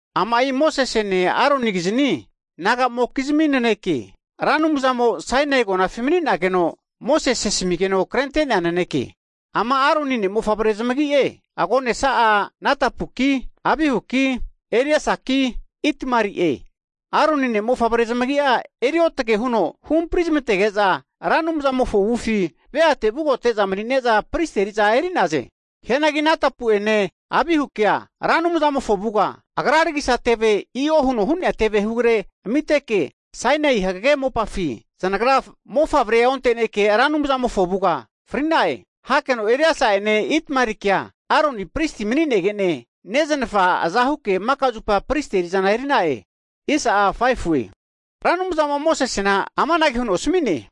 Ama'i Mosesene, Aronikizni naga'mokizmi naneke, Ra Anumzamo Sainai agonafi Mosese asamigeno krente'nea naneke. Ama Aroni ne'mofavre'mokizmi zamagi'e, Agonesa'a Nadabuki, Abihuki, Eliesaki, Itamari'e. Anantera Aroni ne'mofavre zamagi eri otage huno huhampri zamantege'za, Ra Anumzamofo avufi veamokizmire te vugote'za mani'ne'za pristi eri'za eri'naze. Hianagi Nadabu'ene Abihukea Ra Anumzamofo avuga agra ragisa teve i'o hu'nea teve hegre amiteke, Sainai hagage mopafi zanagra mofavrea onte'neke Ra Anumzamofo avuga fri'na'e. Hakeno Eliesa'ene Itamarikea, Aroni pristia mani'negene neznafa azahuke maka zupa pristi eri'zana eri'na'e. Ra Anumzamo Mosesena amanage huno asami'ne,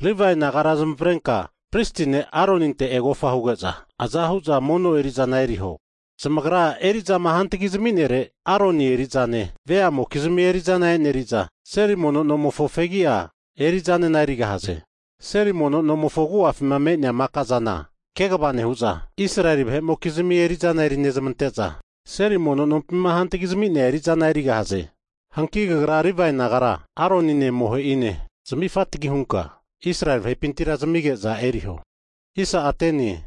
Livae nagara zamavarenka pristi ne' Aroninte egofa huge'za, aza hu'za mono eri'zana eriho. Zamagra eri'zama hantagi zami'nere Aroni eri'zane, veamokizmi eri'zane eneri'za, seli mono nomofo fegi'a eri'zanena erigahaze. Seli mono nomofo agu'afima me'nea maka'zana kegava nehu'za, Israeli vahe'mokizmi eri'za eri nezmante'za, seli mono nompima hantagi zami'nea eri'zana erigahaze. Hanki kagra Livae nagara Aronine amohe'ine zami vagarenka Israeli vahepintira zamige'za eri'zana eriho.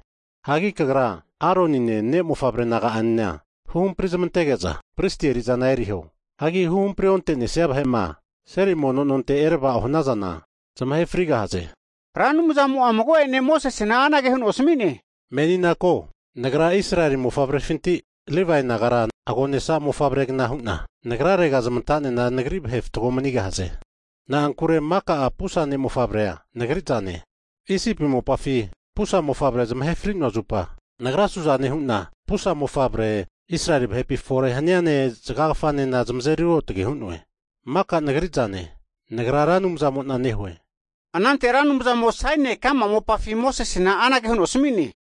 Hagi kagra Aronine ne'mofavre naga'anena huhampri zamantege'za pristi eri'zana eriho. Hagi huhampri onte'nesia vahe'ma seli mono nonte eravao hanazana zamahe frigahaze. Ra Anumzamo mago'ene Mosesena anage huno asami'ne, Menina ko, Nagra Israeli vahepinti Livae nagara agonesa ne'mofavre'gna hu'na zamavarena Nagrarega zamantoge'za nagri vahe fatgo mani'naze. Na'ankure maka'a pusa ne'mofavrea Nagri zane, Isipi mopafi pusa ne'mofavre zamahe fri'noa zupa, Nagra su'zane hu'na pusa ne'mofavre Israeli vahepi fore haniane, zagagafanena huhampri'noe. Maka Nagri zane, Nagra Ra Anumzamo'na nehue. Anante Ra Anumzamo Sainai ka'ma mopafi Mosesena anage huno asami'ne,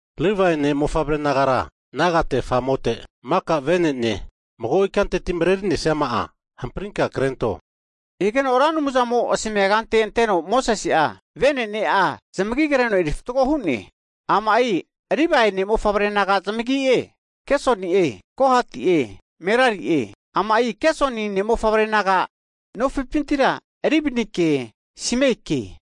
Levai ne'mofavre nagara nagate famote, maka venene mago ikanteti marerinesima'a hamprinka zamagia krento. Higeno Ra Anumzamo asmia kante anteno Mosese'a venene'a zamagia kreno eri fatgo hu'ne. Ama'i Livae ne'mofavre naga zamagie, Gersoni'e, Kohati'e, Merari'e. Ama'i Gersoni ne'mofavre naga nofipintira Libnike, Simeike,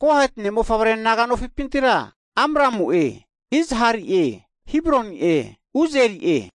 Kohati ne'mofavre naga'nofipintira Amramu'e, Izhari'e, Hebroni'e, Usieli'e.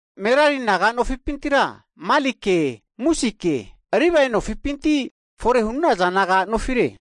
Merari naga nofipintira Malike, Musike. Livae nofipinti fore hu'naza naga nofi mani'naze.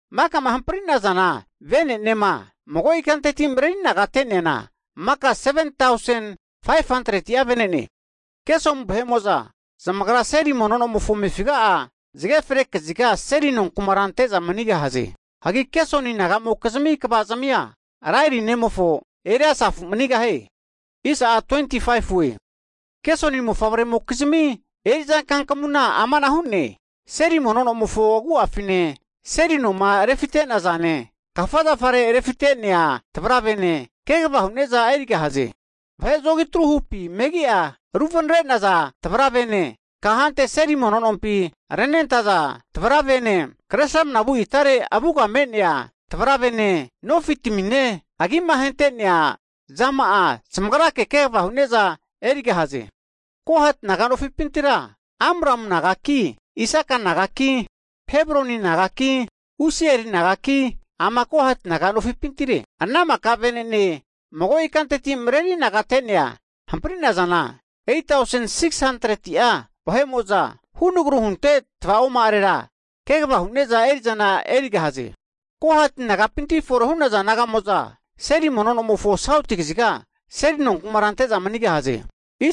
Makama hampri'nazana venenema, mago ikanteti mreri anagate'neana, maka seven tausen 500'a vene'ne. Gersoni vahe'mo'za zamagra seli mono nomofo amefiga'a zage fre kaziga seli nonkumara ante'za manigahaze. Hagi Gersoni naga'mokizmi kvazamia Laeli ne'mofo Eleasafi manigahie. Hagi Gersoni ne'mofavremokizmi eri'za kankamuna amana hu'ne, seli nomofo agu'afine, seli noma refimate'zane, kafa zafare refite'nea tvaravene, kegava hu'neza erigahaze. Vahe atru hu kumapi, megi'a ruvanre'naza tvaravene, kahante seli nompi renentaza tvaravene, kresramna vu itare avuga me'nea tvaravene, nofitamine, agima hentea zama'a zamagrake kegava hu'neza erigahaze. Hagi Kohati naga nofipintira, Amramu nagaki, Ishara nagaki, Hebroni nagaki, Usiel nagaki, ana maka vene'ne mago ikanteti mareri anagate'nea hampri'nazana, 8tausen 600'a vahe'mo'za hunagru hunte tva'oma'arera kegava hu'neza eri'zana erigahaze. Kohati nagapinti fore hu'naza naga'mo'za, seli mono nomofo sauti kaziga seli nonkumara ante'za manigahaze.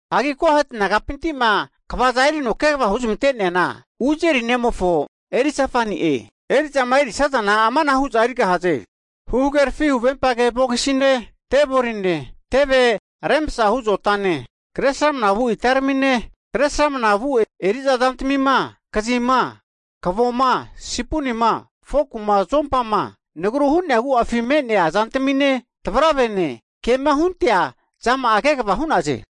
Hagi Kohati nagapintima kvaza erino kegava huzmante'neana, Uzieli nemofo Elizafani'e. Eri'zama erisazana amanahu hu'za erigahaze, huhagerafi huvempage vogisine, teboline, tevi rekru hunte zotane, Kresramana vu itaramine, kresramna vu eri'za zantamima kazima, kavoma, sipunima, foku'ma, zompama (utensils), nagru hu'nea agu'afi me'nea zantamine, tvaravene kema huntea zama'a kegava hugahaze.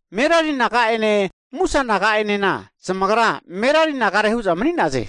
Merari naga'ene Musa naga'enena, zamagra Merari nagare hu'za mani'naze.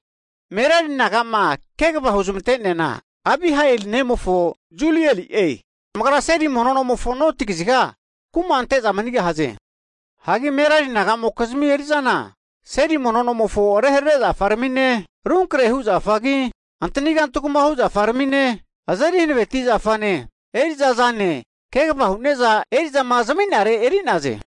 Merari nagama kegava huzmante'neana, Abihail nemofo Zulieli'e. Zamagra seli mono nomofona noti kaziga kuma ante'za manigahaze. Hagi Merari naga'mokizmi eri'zana, seli mono nomofo reharere zafarmine, arunkre hu zafagi, antani kantugma hu' zafarmine, azeri hanaveti zafane, eriza'zane kegava hu'neza eri'zama zami'nare eri'naze.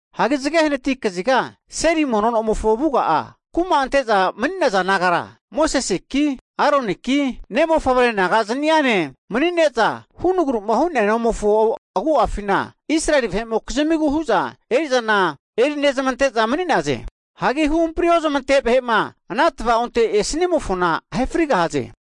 Hanki zage hanati kaziga seli mono nomofo avuga'a kuma ante'za mani'naza nagara, Moseseki, Aroniki, ne'mofavre naga'zniane mani'neza, hunagruma hu'nea nomofo agu'afina Israeli vahe'mokizmigu hu'za eri'zana eri nezmante'za mani'naze. Hagi huhampri ozmante vahe'ma ana tva'onte esnimofona ahe frigahaze.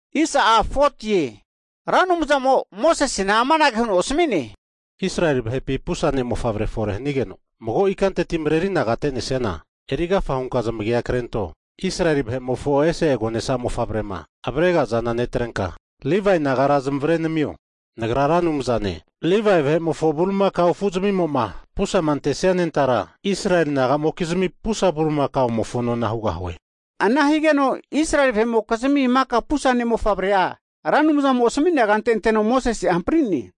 Hagi Ra Anumzamo Mosesena amanage huno asami'ne, Israeli vahepi pusa ne'mofavre fore hanigeno mago ikanteti mareri anagate'nesiana, erigafa hunka zamagi'a krento. Israeli vahe'mofo ese agonesa mofavrema avregazana netrenka Livae nagara zamavare namio, Nagra Ra Anumzane, Livae vahe'mofo bulimakao afuzmimo'ma pusama antesia anentara, Israeli nagamokizmi pusa bulimakamofo nona hugahie. Ana higeno Israeli vahe'mokizmi maka pusa ne'mofavre'a Ra Anumzamo asmi'nea kante anteno Mosese'a hampri'ne.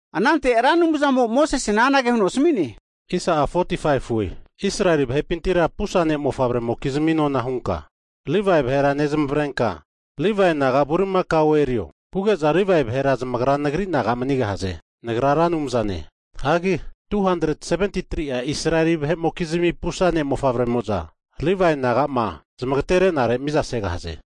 Anante Ra Anumzamo'a Mosesena anage huno asami'ne, Israeli vahepintira pusa ne' mofavre'mokizmi nona hunka, Livae vahera nezmavrenka, Israeli vahe agonesa bilimakao nona hunka Livae naga bulimakaone erio. Huge'za Livae vahera zamagra Nagri naga manigahaze. Nagra Ra Anumzane. Hagi 273'a Israeli vahe'mokizmi pusa ne'mofavre'moza, Livae naga'ma zamagtere'nare miza segahaze.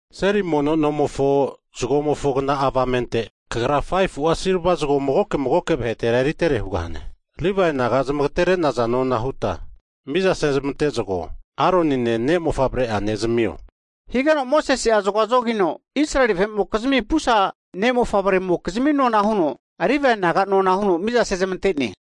Seli mono nomofo zagomofo kna'a avamente kagra 5fu'a silva zago magoke magoke vahetera eritere hugahane. Livae naga zamagtere'naza nona huta miza sezmante zago, Aronine ne'mofavre'ane zamio. Higeno Mosese'a zagoa zogino Israeli vahe'mokizmi pusa ne'mofavre'mokizmi nona huno Livae naga nona huno miza sezmante'ne.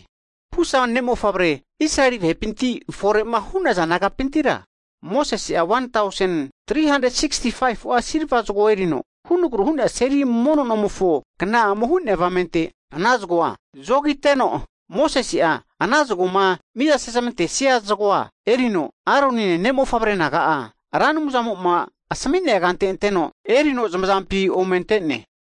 Pusa ne'mofavre Israeli vahepinti fore'ma hu'naza nagapintira Mosese'a 1tausen, 365'a silva zagoa erino, hunagru hu'nea seli mono nomofo kna'amo hu'nea avamente ana zago'a zogite'no Mosese'a ana zagoma mizama sezmantesia zagoa erino Aroni'ne, ne'mofavre naga'a Ra Anumzamo'ma asami'nea kante erino zamazampi ome ante'ne.